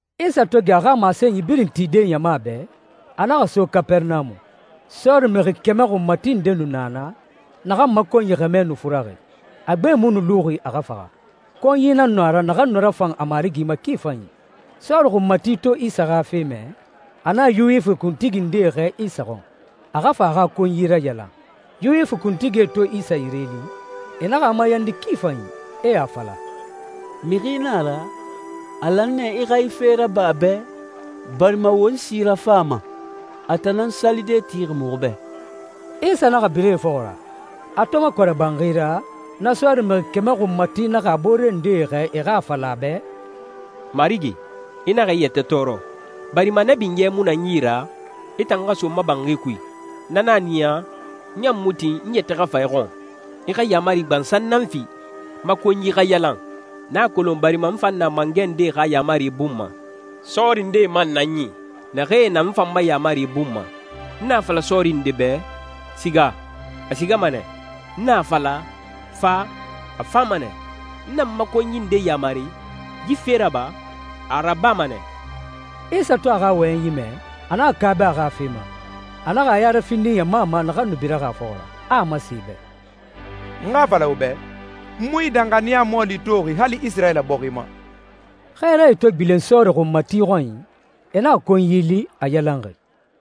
Isa to gɛ a xa masenyi birin tide ɲama bɛ, a naxa so Kapɛrɛnamu. Sɔɔri mixi kɛmɛ xunmati nde nu na naa, naxan ma konyi xɛmɛ nde nu furaxi, a gbe mu nu luxi a xa faxa. Konyi nan nu a ra naxan nu rafan a marigi ma ki fanyi. Sɔɔri xunmati to Isa xa fe mɛ, a naxa Yuwifi kuntigi ndee xɛɛ Isa xɔn, a xa fa a xa konyi rayalan. Yuwifi kuntigie to Isa yire li, e naxa a mayandi ki fanyi, e a fala, «Mixi na a ra, a lan nɛ i xa yi fe raba a bɛ, barima won si rafan a ma. A tan nan salide tixi muxu bɛ.» Isa naxa bira e fɔxɔ ra. A to makɔrɛ banxi ra, na sɔɔri mixi kɛmɛ xunmati naxa a boore ndee xɛɛ e xa a fala a bɛ, «Marigi, i naxa i yɛtɛ tɔɔrɔ, barima na binyɛ mu na n yi ra i tan xa so n ma banxi kui. Na nan a niya, n ɲan mu tin n yɛtɛ xa fa i xɔn. I xa yaamari gbansan nan fi, n ma konyi xa yalan. N a kolon barima n fan na mangɛ ndee xa yaamari bun ma, sɔɔri ndee man na n yi, naxee na n fan ma yaamari bun ma. N na a fala sɔɔri nde bɛ, ‹Siga,› a sigama nɛ. N na a fala, ‹Fa,› a fama nɛ. N na n ma konyi nde yamari, ‹Yi fe raba,› a a rabama nɛ.» Isa to a xa wɔyɛnyi mɛ, a naxa kaaba a xa fe ma. A naxa a ya rafindi ɲama ma naxan nu biraxi a fɔxɔ ra, a a masen e bɛ, «N xa a fala wo bɛ, n mu yi danxaniya mɔɔli toxi hali Isirayila bɔxi ma.» Xɛɛrae to gbilen sɔɔri xunmati xɔnyi, e naxa konyi li, a yalanxi.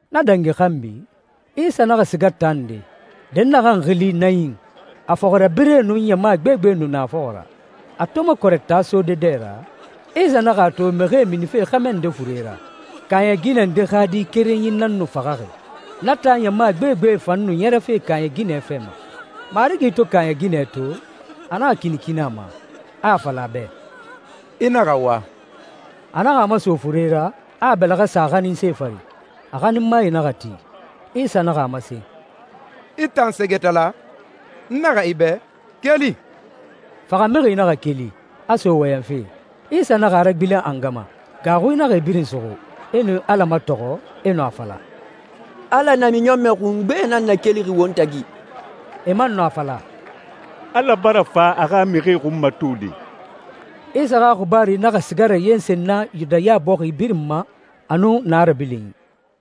Na dangi xanbi, Isa naxa siga taa nde, dɛnnaxɛ xili Nayin, a fɔxirabirɛe nun ɲama gbegbe nu na a fɔxɔ ra. A to makɔrɛ taa sode dɛ ra, Isa naxa a to mixie minife xɛmɛ nde fure ra. Kaaɲɛ ginɛ nde xa di kerenyi nan nu faxaxi, na taa ɲama gbegbe fan nu ɲɛrɛfe kaaɲɛ ginɛ fɛ ma. Marigi to kaaɲɛ ginɛ to, a naxa kinikini a ma, a a fala a bɛ, «I naxa wa.» A naxa a maso fure ra, a a bɛlɛxɛ sa a xaninse fari, a xaninmae naxa ti. Isa naxa a masen, «I tan sɛgɛtala, n naxɛ i bɛ, keli!» Faxamixi naxa keli, a so wɔyɛnfe. Isa naxa a ragbilen a nga ma. Gaaxui naxa e birin suxu, e nu Ala matɔxɔ, e nu a fala, «Ala namiɲɔnmɛ xungbe nan nakelixi won tagi!» E man nu a fala, «Ala bara fa a xa mixie xunmatode!» Isa xa xibaaru naxa siga rayensen na Yudaya bɔxi birin ma a nun naa rabilinyi.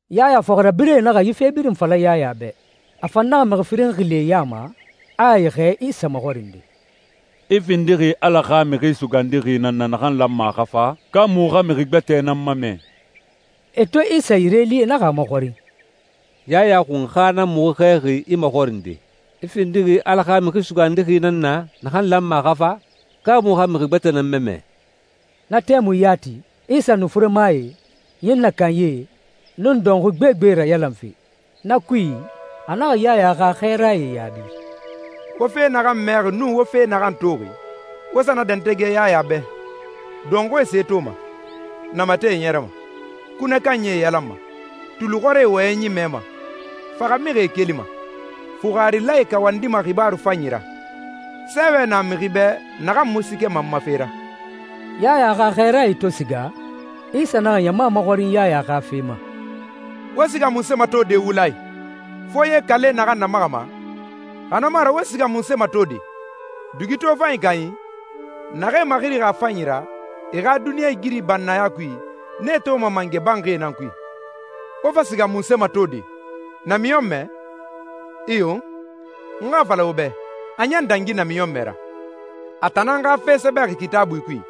Yaya fɔxirabirɛe naxa yi fe birin fala Yaya bɛ. A fan naxa mixi firin xili e ya ma, a e xɛɛ Isa maxɔrinde, «I findixi Ala xa Mixi Sugandixi nan na naxan lanma a xa fa, ka muxu xa mixi gbɛtɛ nan mamɛ?» E to Isa yire li e naxa a maxɔrin, «Yaya Xunxa nan muxu xɛɛxi i maxɔrinde. I findixi Ala xa Mixi Sugandixi nan na naxan lanma a xa fa, ka muxu xa mixi gbɛtɛ nan mamɛ?» Na tɛmui yati, Isa nu furemae, ɲinnɛ kanyie, nun dɔnxui gbegbe rayalanfe. Na kui, a naxa Yaya xa xɛɛrae yaabi, «Wo fe naxan mɛxi nun wo fe naxan toxi, wo sa na dɛntɛgɛ Yaya bɛ. Dɔnxuie se toma, namatɛe ɲɛrɛma, kunɛ kanyie yalanma, tulixɔrie wɔyɛnyi mɛma, faxamixie kelima, fuxarilae kawandima xibaaru fanyi ra. Sɛɛwɛ na mixi bɛ naxan mu siikɛma n ma fe ra.» Yaya xa xɛɛrae to siga, Isa naxa ɲama maxɔrin Yaya xa fe ma, «Wo siga munse matode wula i? Foye kale naxan namaxama? Xa na mu a ra, wo siga munse matode? Dugi tofanyi kanyi? Naxee maxirixi a fanyi ra, e xa duniɲɛ igiri bannaya kui, nee toma mangɛ banxie nan kui. Wo fa siga munse matode? Namiɲɔnmɛ? Iyo, n xa a fala wo bɛ, a ɲan dangi namiɲɔnmɛ ra. A tan nan xa fe sɛbɛxi Kitaabui kui,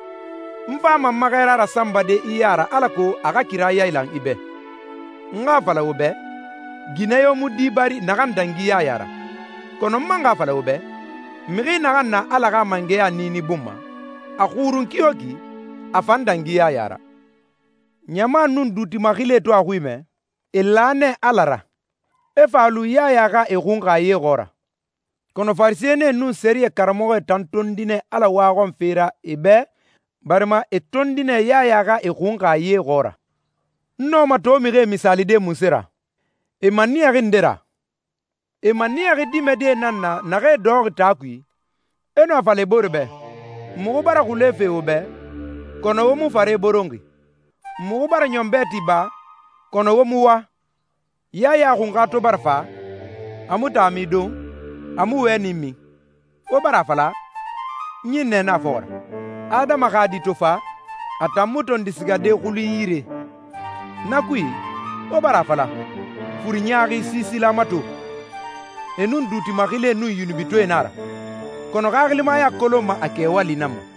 ‹N fama n ma xɛɛra rasanbade i ya ra alako a xa kira yailan i bɛ.› N xa a fala wo bɛ, ginɛ yo mu di bari naxan dangi Yaya ra. Kɔnɔ n man xa a fala wo bɛ, mixi naxan na Ala xa mangɛya niini bun ma, a xurun kiyoki, a fan dangi Yaya ra.» «Ɲama nun duuti maxilie to a xui mɛ, e la nɛ Ala ra, e fa lu Yaya xa e xunxa ye xɔɔra. Kɔnɔ Farisɛnie nun sɛriyɛ karamɔxɔe tan tondi nɛ Ala waxɔnfe ra e bɛ barima e tondi nɛ Yaya xa e xunxa ye xɔɔra.» «N nɔma to mixie misaalide munse ra? E maniyaxi nde ra? E maniyaxi dimɛdie nan na naxee dɔxɔxi taa kui, e nu a fala e booree bɛ, ‹Muxu bara xule fe wo bɛ, kɔnɔ wo mu fare boronxi. Muxu bara ɲɔn bɛɛti ba, kɔnɔ wo mu wa.›» «Yaya Xunxa to bara fa, a mu taami don, a mu wɛni min. Wo bara a fala, ‹Ɲinnɛ na a fɔxɔ ra.› Adama xa Di to fa, a tan mu tondi sigade xulunyi yire. Na kui, wo bara a fala, ‹Furi ɲaaxi siisila mato! E nun duuti maxilie nun yunubitɔɛe nan a ra!› Kɔnɔ xaxilimaya kolonma a kɛwali nan ma.»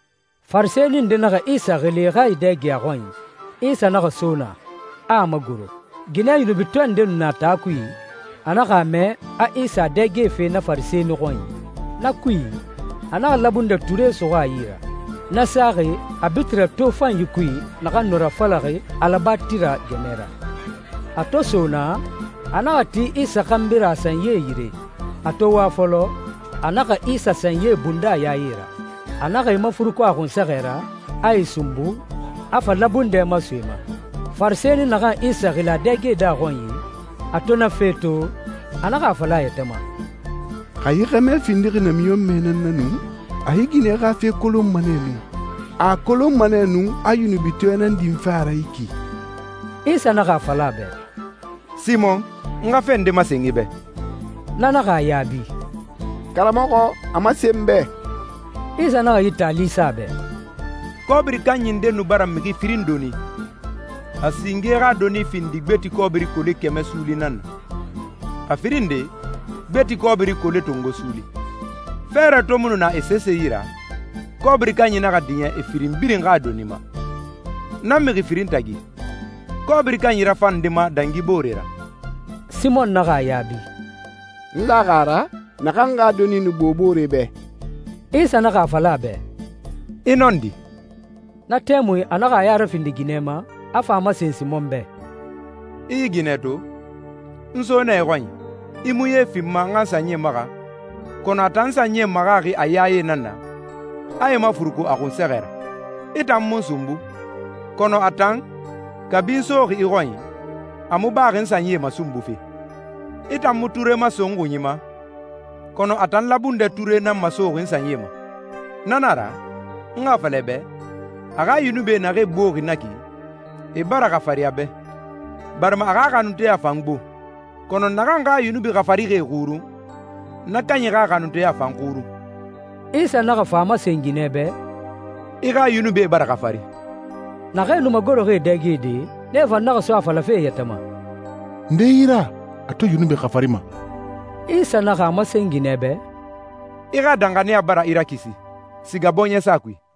Farisɛni nde naxa Isa xili e xa e dɛge a xɔnyi. Isa naxa so naa, a a magoro. Ginɛ yunubitɔɛ nde nu na taa kui, a naxa a mɛ a Isa a dɛgɛfe na Farisɛni xɔnyi. Na kui, a naxa labundɛ ture suxu a yi ra, na saxi a bitirɛ tofanyi kui naxan nu rafalaxi alabatira gɛmɛ ra. A to so naa, a naxa ti Isa xanbi ra a sanyi yire. A to wa fɔlɔ, a naxa Isa sanyie bunda a yaye ra. A naxa e mafuruku a xunsɛxɛ ra, a e sunbu, a fa labundɛ maso e ma. Farisɛni naxan Isa xili a dɛgede a xɔnyi, a to na fe to, a naxa a fala a yɛtɛ ma, «Xa yi xɛmɛ findixi namiɲɔnmɛ nan na nu, a yi ginɛ xa fe kolonma nɛ nu, a a kolonma nɛ nu a yunubitɔɛ nan dinfe a ra yi ki.» Isa naxa a fala a bɛ, «Simɔn, n xa fe nde masen i bɛ.» Na naxa a yaabi, «Karamɔxɔ, a masen n bɛ.» Isa naxa yi taali sa a bɛ, «Kɔbiri kanyi nde nu bara mixi firin doni. A singe xa doni findixi gbeti kɔbiri kole kɛmɛ suuli nan na, a firin nde, gbeti kɔbiri kole tongo suuli. Fɛɛrɛ to mu nu na e sese yi ra, kɔbiri kanyi naxa diɲɛ e firin birin xa doni ma. Na mixi firinyi tagi, kɔbiri kanyi rafanma nde ma dangi boore ra?» Simɔn naxa a yaabi, «N laxi a ra, naxan xa doni nu gbo boore bɛ.» Isa naxa a fala a bɛ, «I nɔndi.» Na tɛmui a naxa a ya rafindi ginɛ ma, a fa a masen Simɔn bɛ, «I yi ginɛ to? N so nɛ i xɔnyi, i mu ye fi n ma n xa n sanyie maxa, kɔnɔ a tan n sanyie maxaxi a yaye nan na, a e mafuruku a xunsɛxɛ ra. I tan mu n sunbu, kɔnɔ a tan, kabi n soxi i xɔnyi, a mu baxi n sanyie masunbufe. I tan mu ture maso n xunyi ma, kɔnɔ a tan labundɛ ture nan masoxi n sanyie ma. Na na a ra, n xa a fala i bɛ, a xa yunubie naxee gboxi na ki, e bara xafari a bɛ, barima a xa xanunteya fan gbo. Kɔnɔ naxan xa yunubi xafarixie xurun, na kanyi xa xanunteya fan xurun.» Isa naxa fa a masen ginɛ bɛ, «I xa yunubie bara xafari.» Naxee nu magoroxi e dɛgede, nee fan naxa so a falafe e yɛtɛ ma, «Nde yi ra a to yunubi xafarima?» Isa man naxa a masen ginɛ bɛ, «I xa danxaniya bara i rakisi. Siga bɔɲɛsa kui.»